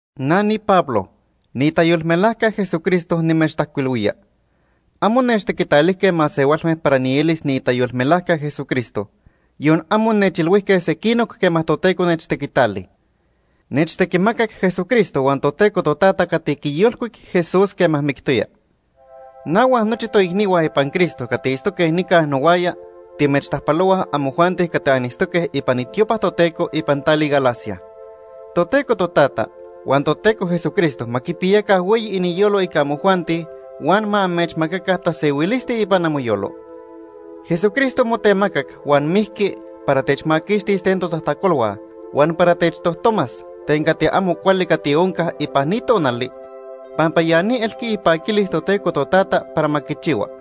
Na niPablo, niitayolmelajca Jesucristo nimechtajcuilhui. Amo nechtequitalijque masehualme para nielis niitayolmelajca Jesucristo, yon amo nechilhuijque sequinoc quema Toteco nechtequitali. Nechtequimacac Jesucristo huan Toteco Totata cati quiyolcuic Jesús quema mictoya. Na huan nochi toicnihua ipan Cristo cati itztoque nica nohuaya timechtajpalohuaj amojuanti cati anitztoque ipan itiopa Toteco ipan tali Galacia. Toteco Totata huan Toteco Jesucristo ma quipiyaca hueyi iniyolo ica amojuanti huan ma amechmacaca tasehuilisti ipan amoyolo. Jesucristo motemacac huan mijqui para techmaquixtis ten totajtacolhua huan para techtojtomas ten cati amo cuali cati onca ipan ni tonali pampa ya ni elqui ipaquilis Toteco Totata para ma quichihua.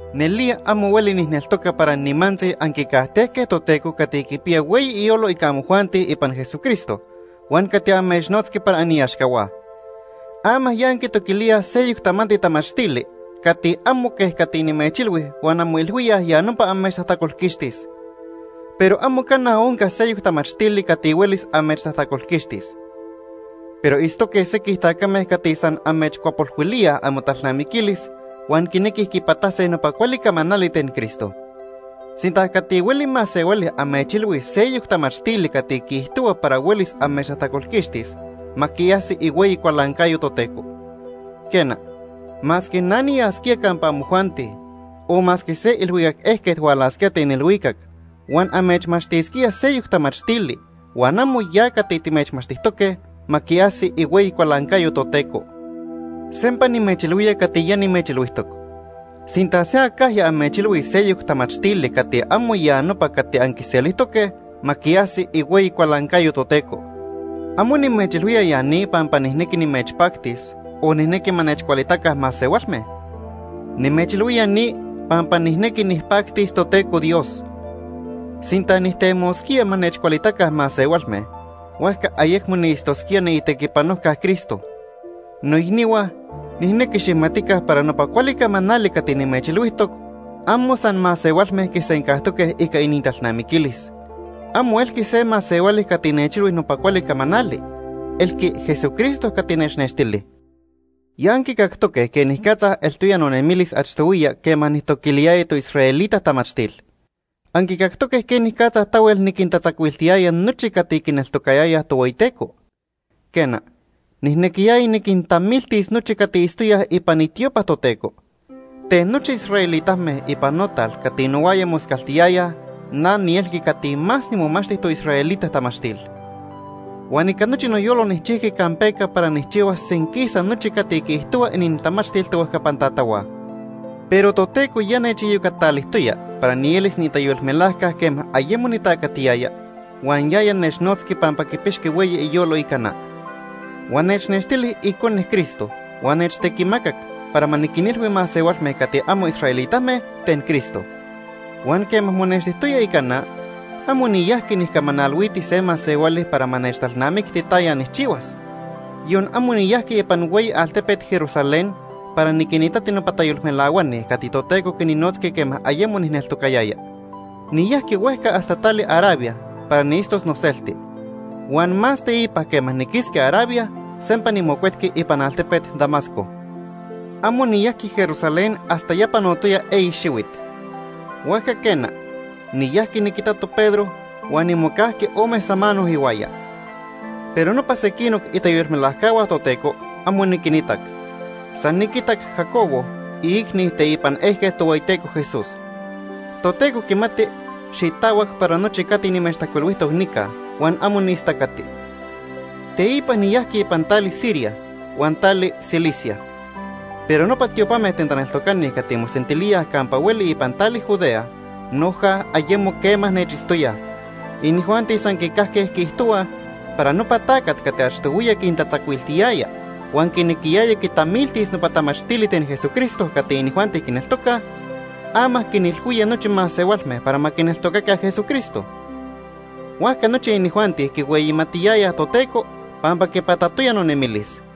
Nelía amo hueli nijneltoca para nimantzi anquicajtejque Toteco cati quipiya hueyi iyolo ica amojuanti ipan Jesucristo huan cati amechnotzqui para aniaxcahua. Ama ya anquitoquilíaj seyoc tamanti tamachtili cati amo quej cati nimechilhui huan anmoilhuíaj ya nopa amechtajtacolquixtis. Pero amo cana onca seyoc tamachtili cati huelis amechtajtacolquixtis. Pero itztoque sequij tacame cati san amechcuapolhuilíaj amotalnamiquilis, huan quinequij quipatase nopa cuali camanali ten Cristo. Sinta cati hueli masehuali amechilhuis seyoc tamachtili cati quiijtohua para huelis amechtajtacolquixtis, ma quiajsi ihueyi cualancayo Toteco. Quena, masque na niyasquía campa amojuanti o masque se ilhuicac ejquet hualasquía ten ilhuicac huan amechmachtisquía seyoc tamachtili huan amo ya cati timechmachtijtoque, ma quiajsi ihueyi cualancayo Toteco. Sempa nimechilhuía cati ya nimechilhuijtoc. Sinta se acajya amechilhuis seyoc tamachtili cati amo ya nopa cati anquiselijtoque, ma quiajsi ihueyi cualancayo Toteco. Amo nimechilhuía ya ni pampa nijnequi nimechpactis, o nijnequi ma nechcualitaca masehualme. Nimechilhuía ni pampa nijnequi nijpactis Toteco Dios. Sinta nijtemosquía ma nechcualitaca masehualme, huajca ayecmo niitztosquía niitequipanojca Cristo. Noicnihua, nijnequi xijmatica para nopa cuali camanali cati nimechilhuijtoc amo san masehualme quisencajtoque ica inintalnamiquilis. Amo elqui se masehuali cati nechilhui nopa cuali camanali, elqui Jesucristo cati nechnextili. Ya anquicactoque quenicatza eltoya nonemilis achtohuiya quema nijtoquiliyaya toisraelita tamachtil. Anquicactoque quenicatza tahuel niquintatzacuiltiyaya nochi cati quineltocayayaj Tohueyiteco. Quena, nijnequiyaya niquintamiltis nochi cati itztoyaj ipan itiopa Toteco. Ten nochi israelitame ipan notal cati nohuaya moscaltiyayaj na nielqui cati más nimomachti toisraelita tamachtil. Huan ica nochi noyolo nijchijqui campeca para nijchihuas senquisa nochi cati quiijtohua inintamachtil tohuejcapan tatahua. Pero Toteco ya nechiyocatalijtoya para nielis niitayolmelajca quema ayemo nitacatiyaya, huan yaya nechnotzqui pampa quipixqui hueyi iyolo ica na. Huan nechnextili Icone Cristo huan nechtequimacac para ma niquinilhui masehualme cati amo israelitame ten Cristo. Huan quema monextijtoya ica na, amo niyajqui nijcamanalhuiti se masehuali para ma nechtalnamicti taya nijchihuas. Yon amo niyajqui ipan hueyi altepet Jerusalén para niquinitati nopa tayolmelahuani cati Toteco quininotzqui quema ayemo nijneltocayaya. Niyajqui huejca hasta tali Arabia para niitztos noselti. Huan más teipa quema niquisqui Arabia, sempa nimocuetqui ipan altepet Damasco. Amo niyajqui Jerusalén hasta ya panotoya eyi xihuit. Huajca quena, niyajqui niquitato Pedro huan nimocajqui ome samano ihuaya. Pero nopa sequinoc itayolmelajcahua Toteco, amo niquinitac. San niquitac Jacobo, iicni teipan ejquet Tohueyiteco Jesús. Toteco quimati xitahuac para nochi cati nimechtajcuilhuijtoc nica huan amo niistacati. Teipa niyajqui ipan tali Siria huan tali Cilicia. Pero nopa tiopame ten taneltocani cati mosentilíaj campa hueli ipan tali Judea noja ayemo quema nechitztoyaj. Inijuanti san quicajque quiijtohuaj para nopa tacat cati achtohuiya quintatzacuiltiyaya huan quinequiyaya quitamiltis nopa tamachtili ten Jesucristo cati inijuanti quineltocaj, ama quinilhuía nochi masehualme para ma quineltocaca Jesucristo. Huajca nochi inijuanti quihueyimatiyayaj Toteco pampa quipatatoya nonemilis.